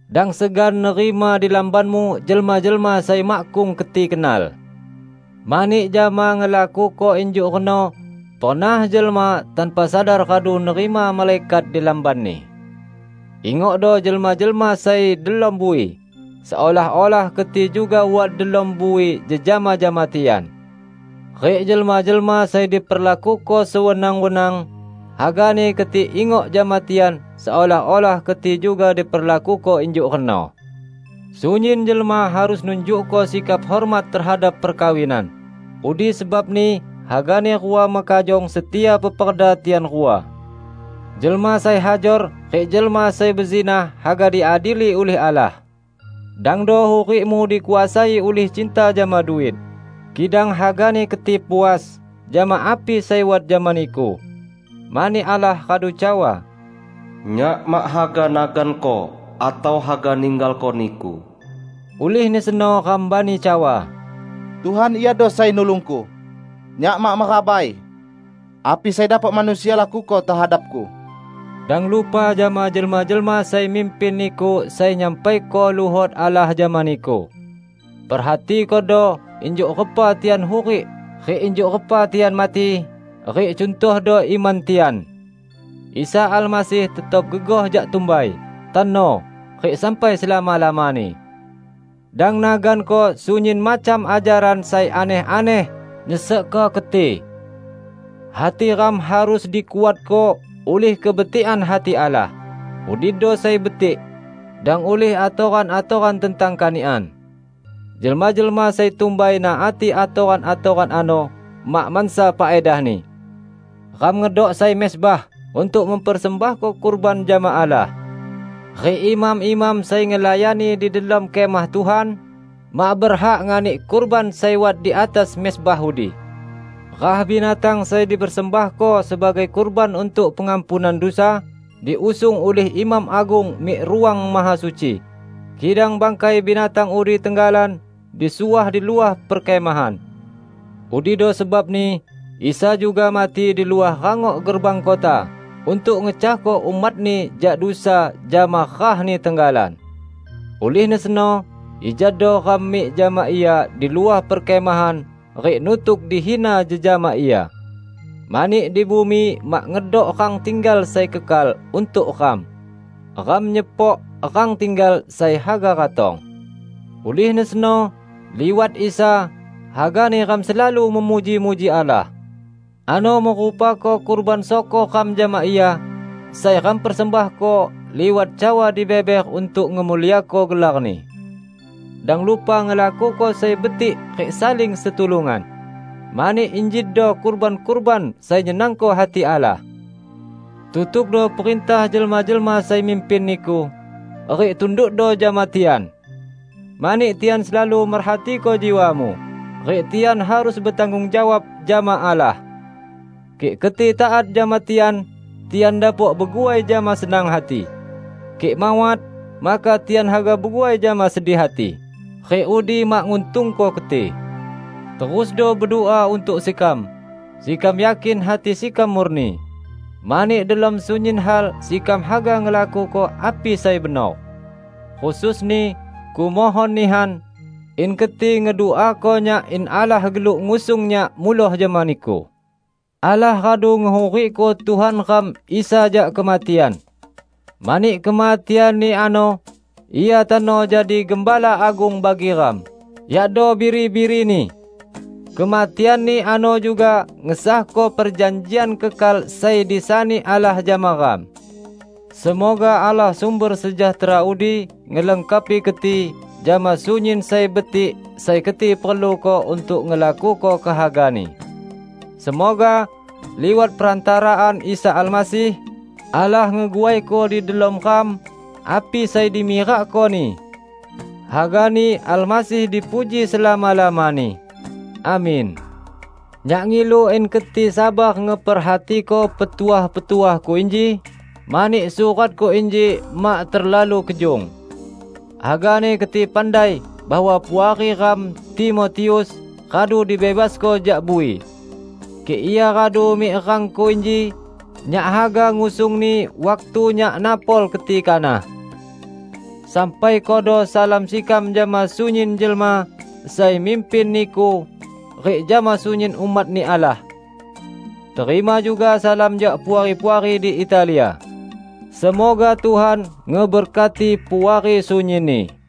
Dang segan nerima di lambanmu jelma-jelma sai makkung keti kenal. Mani jama ngelakuko injuk reno, pernah jelma, tanpa sadar, radu nerima malaikat di lambanni. Ingokdo jelma-jelma sai delom bui, seolah-olah keti juga wat delom bui jejama jama tian. Rik jelma-jelma sai diperlakuko sewenang-wenang, hagani keti ingok jama tian seolah-olah keti juga diperlakuko injuk reno. Sunyin jelma harus nunjukko sikap hormat tehadap perkawinan, udi sebabni hagani rua mekajong setia peperda tian rua. Jelma sai hajor rik jelma sai bezinah haga diadili ulih Allah. Dangdo hurikmu dikuasai ulih cinta jama duit, kidang hagani keti puas jama api sai wat jama niku. Mani Allah radu cawa, "Nyak mak haga naganko atau haga ninggalko niku." Ulihni seno ram bani cawa, "Tuhan iado Sai Nulungku, nyak mak merabai. Api sai dapok manusia lakuko tehadapku?" Dang lupa jama jelma-jelma sai mimpin niku sai nyampaiko luhot Allah jama niku. Perhatikodo injuk repa tian hurik rik injuk repa tian mati, rik cuntohdo iman tian. Isa Almasih tetap gegoh jak tumbai, tano, rik sampai selama-lamani. Dang naganko sunyin macam ajaran sai aneh-aneh nyesekko keti. Hati ram harus dikuatko ulih kebetikan hati Allah, udido sai betik; dang ulih atoran-atoran tentang kanikan. Jelma-jelma sai tumbai naati atoran-atoran ano mak mansa faedahni. Ram ngedok sai mezbah untuk mempersembahko kurban jama Allah. Rik imam-imam sai ngelayani di delom Kemah Tuhan, mak berhak nganik kurban sai wat di atas mezbah udi. Rah binatang sai dipersembahko sebagai kurban untuk pengampunan dusa, diusung ulih imam agung mik Ruang Mahasuci, kidang bangkai binatang udi tenggalan disuah di luah perkemahan. Udido sebabni Isa juga mati di luah rangok gerbang kota untuk ngecahko umat-Ni jak dusa jama rah-Ni tenggalan. Ulihni seno, ijado ram mik jama Ia di luah perkemahan rik nutuk dihina jejama Ia. Mani di bumi mak ngedok rang tinggal sai kekal untuk ram; ram nyepok rang tinggal sai haga ratong. Ulihni seno, liwat Isa, hagani ram selalu memuji-muji Allah; ano merupako kurban syukor ram jama Ia, sai ram persembahko liwat cawa dibeber untuk ngemuliako gelar-Ni. Dang lupa ngelakuko sai betik rik saling setulungan, mani injido kurban-kurban sai nyenangko hati Allah. Tutukdo perintah jelma-jelma sai mimpin niku, rik tundukdo jama tian. Mani tian selalu merhatiko jiwamu, rik tian harus betanggung jawab jama Allah. Kik keti taat jama tian, tian dapok beguai jama senang hati; kik mawat, maka tian haga beguai jama sedih hati, rik udi mak nguntungko keti. Terusdo bedua untuk sekam. Sekam yakin hati sekam murni, mani delom sunyin hal sekam haga ngelakuko api sai benor. Khususni kumohon nihan, in keti ngeduako nyak in Allah geluk ngusung nyak muloh jama niku. Allah radu ngehurikko Tuhan ram Isa jak kematian. Mani kematian-Ni ano Ia tano jadi Gembala Agung bagi ram, yakdo biri-biri-Ni. Kematian-Ni ano juga ngesahko perjanjian kekal sai disani Allah jama ram. Semoga Allah sumber sejahtera udi ngelengkapi keti jama sunyin sai betik sai keti perluko untuk ngelakuko kehaga-Ni. Semoga liwat perantaraan Isa Almasih, Allah ngeguaiko di delom ram, api sai dimirakko-Ni. Hagani Almasih dipuji selama-lamani! Amin. Nyak ngilu in keti sabar ngeperhatiko petuah-petuahku inji, mani suratku inji mak terlalu kejung. Hagani keti pandai bahwa puari ram Timotius radu dibebasko jak bui. Kik ia radu mik rangku inji, nyak haga ngusungni waktu nyak napol keti kanah. Sampaikodo salam sekam jama sunyin jelma sai mimpin niku rik jama sunyin umat-Ni Allah. Terima juga salam jak puari-puari di Italia. Semoga Tuhan ngeberkati Puari sunyinni.